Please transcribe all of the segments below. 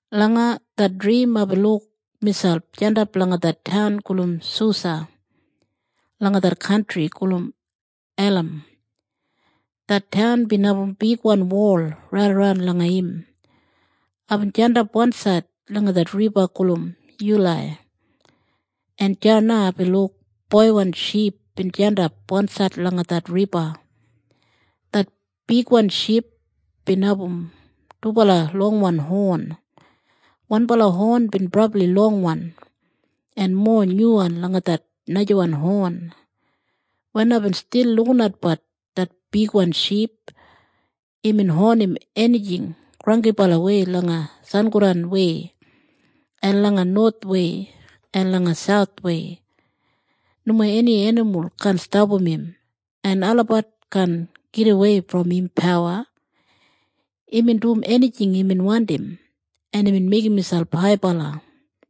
Langa det drim aibin luk miselp jandap langa det taun gulum Susa langa det kantri gulum Elam. Det taun bin abum bigwan wol raidaran langa im. Aibin jandap wansaid langa det riba gulum Yulai. En deya na aibin luk boiwan ship bin jandap wansaid langa det riba. Det bigwan ship bin abum dubala longwan hon. Wanbala hon bin brabli longwan en mowa nyuwan langa det najawan hon. Wen aibin stil lukinatbat det bigwan ship, imbin honim enijing granggibalawei langa sangodanwei, en langa nowathwei en langa sauthwei. Nomo eni enimul kaan stapam im en olabat kaan gidawei brom im pawa. Imbin dum enijing imbin wandim, en imbin meigim miselp haibala.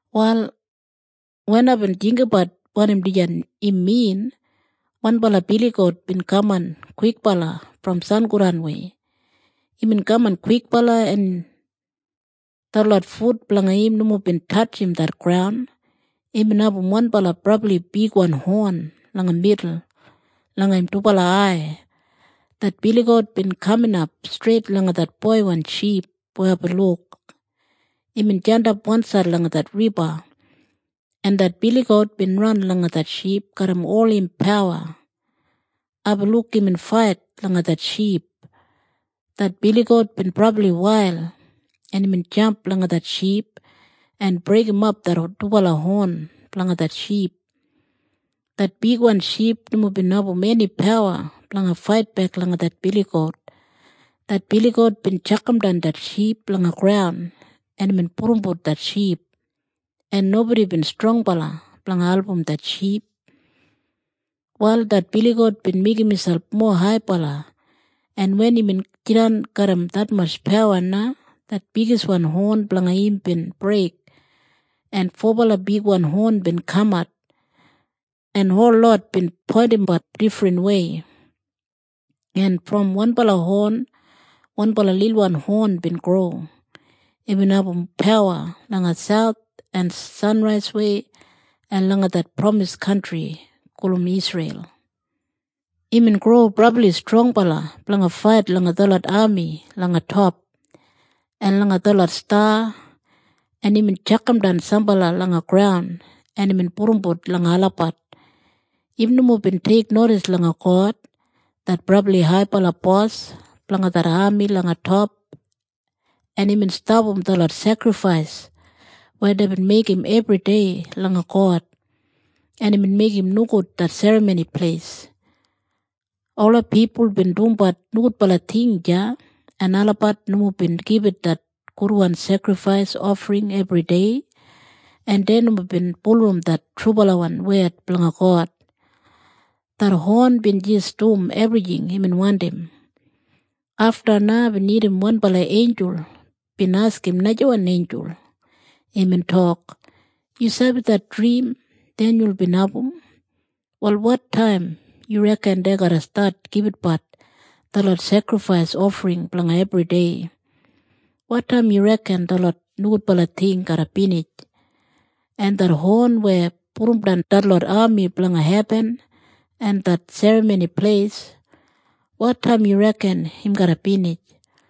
Wal wen aibin jinggabat wanim dijan im min, wanbala biligout bin kaman kwikbala brom sangodanwei. Imbin kaman kwikbala, en detlot fut blanga im nomo bin tatjim det graun. Imbin abum wanbala brabli bigwan hon langa midul langa im dubala ai. Det biligout bin kaminap streit langa det boiwan ship weya aibin luk imbin jandap wansaid langa det riba, en det biligout bin ran langa det ship garram ol im pawa. Aibin luk imbin fait langa det ship. Det biligout bin brabli wail en imbin jamp langa det ship en breigimap det dubala hon blanga det ship. Det bigwan ship nomo bin abum eni pawa blanga faitbek langa det biligout. Det biligout bin tjakamdan det ship langa graun en imbin pudumbut det ship, en nobodi bin strongbala blanga album det ship. Wal det biligout bin meigim miselp mowa haibala, en wen imbin jidan garram detmatj pawa na det bigiswan hon blanga im bin breik, en fobala bigwan hon bin kamat, en holot bin poindimbat difrinwei. En brom wanbala hon wanbala lilwan hon bin gro. Imbin abum pawa langa sauth en sanraiswei en langa det pramis kantri gulum Isreil. Imbin gro brabli strongbala blanga fait langa detlot ami langa top, en langa detlot sta, en imbin tjakamdan sambala langa graun en imbin pudumbut langa olabat. Im nomo bin teiknodis langa God, det brabli haibala bos blanga det ami langa top en imbin stapam detlot sekrifais weya deibin meigim ebridei langa God, en imbin meigim nogud det Serramoni Pleis. Ola pipul bin dumbat nogudbala ting deya, en olabat nomo bin gibit det gudwan sekrifais ofring ebridei, en dei nomo bin bulurrum det trubalawan wed blanga God. Det hon bin jis dum ebrijing imbin wandim. Afta na aibin irrim wanbala einjul bin askim najawan einjul. Imbin tok, “Yu sabi det drim Denyul bin abum? Wal wotaim yu reken dei garra stat gibitbat detlot sekrifais ofring blanga ebridei? Wotaim yu reken detlot nogudbala ting garra binij? En det hon weya pudumdan detlot ami blanga hebin en det Serramoni Pleis, wotaim yu reken im garra binij?”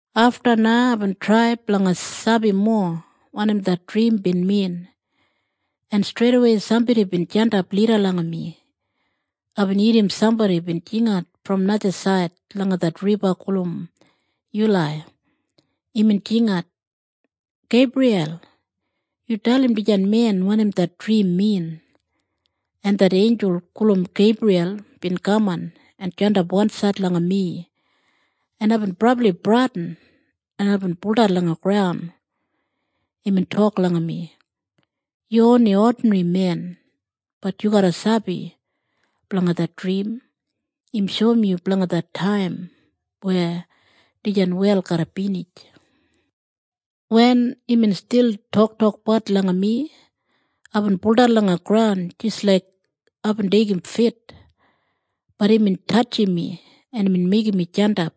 Afta na aibin trai blanga sabi mowa wanim det drim bin min en streidawei sambodi bin jandap lida langa mi. Aibin irrim sambodi bin jingat brom najasaid langa det riba gulum Yulai. Imbin jingat, “Geibriyal, yu dalim dijan men wanim det drim min.” En det einjul gulum Geibriyal bin kaman en jandap wansaid langa mi en aibin brabli bradin en aibin buldan langa graun. Imbin tok langa mi, “Yu oni odinrimen, bat yu garra sabi blanga det drim. Im shoum yu blanga det taim weya dijan wel garra binij.” Wen imbin stil toktokbat langa mi, aibin buldan langa graun jis laik aibin deigim fit, bat imbin tatjim mi en imbin meigim mi jandap.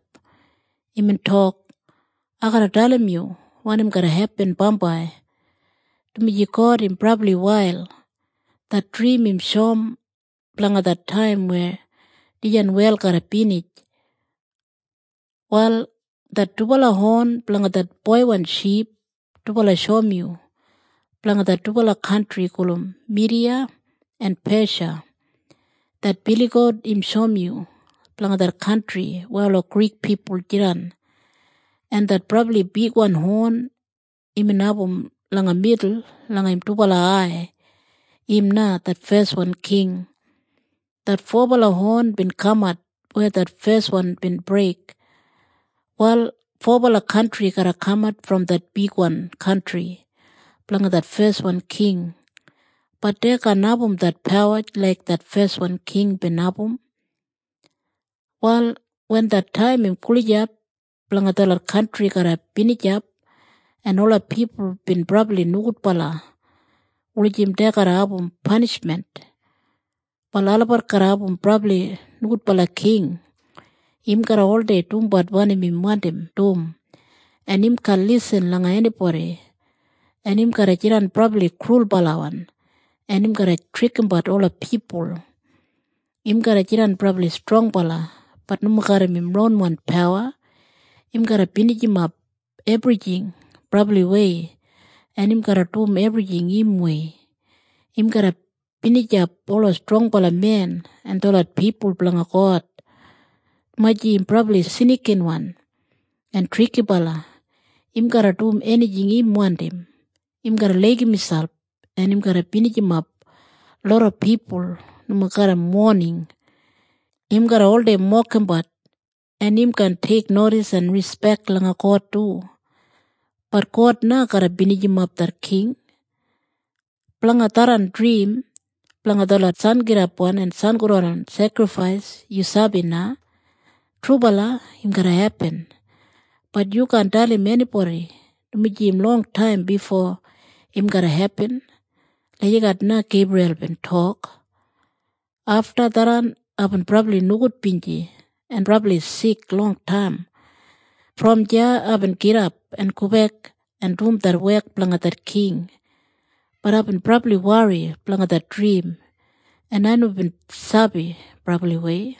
Imbin tok, “Ai garra dalim yu wanim garra hepin bambai dumaji God im brabli wail. Det drim im shoum blanga det taim weya dijan wel garra binij. “Wal det dubala hon blanga det boiwan ship, dubala shoum yu blanga det dubala kantri gulum Midiya en Pesha. Det biligout im shoum yu blanga det kantri weya ola Grik pipul jidan, en det brabli bigwan hon imbin abum langa midul langa im dubala ai, im na det feswan king. Det fobala hon bin kamat weya det feswan bin breik. Wal fobala kantri garra kamat brom det bigwan kantri blanga det feswan king bat dei kaan abum det pawa laik det feswan king bin abum. “Wal wen det taim im gulijap blanga detlot kantri garra binijap en ola pipul bin brabli nogudbala wulijim dei garra abum panishmen, wal olabat garra abum brabli nogudbala king. Im garra oldei dumbat wanim im wandim dum en im kaan lisin langa enibodi, en im garra jidan brabli krulbalawan en im garra trikimbat ola pipul. Im garra jidan brabli strongbala, bat nomo garram im ronwan pawa. Im garra binijimap ebrijing brabliwei en im garra dum ebrijing im wei. Im garra binijap ola strongbala men en detlot pipul blanga God. Dumaji im brabli snikinwan en trikibala, im garra dum enijing im wandim. Im garra laigim miselp en im garra binijimap loda pipul nomo garram woning. Im garra oldei mokimbat en im kaan teiknodis en rispek langa God du, bat God na garra binijimap det king. Blanga tharran drim blanga detlot sangidap en sangodan sekrifais yu sabi na. Trubala im garra hepin. Bat yu kaan dalim enibodi, dumaji im longtaim bifo im garra hepin.” Lagijat na Geibriyal bin tok. Afta tharran aibin brabli nogudbinji en brabli sik longtaim. Brom deya aibin gidap en gobek en dum det wek blanga det king, bat aibin brabli wori blanga det drim en ai nomo bin sabi brabliwei.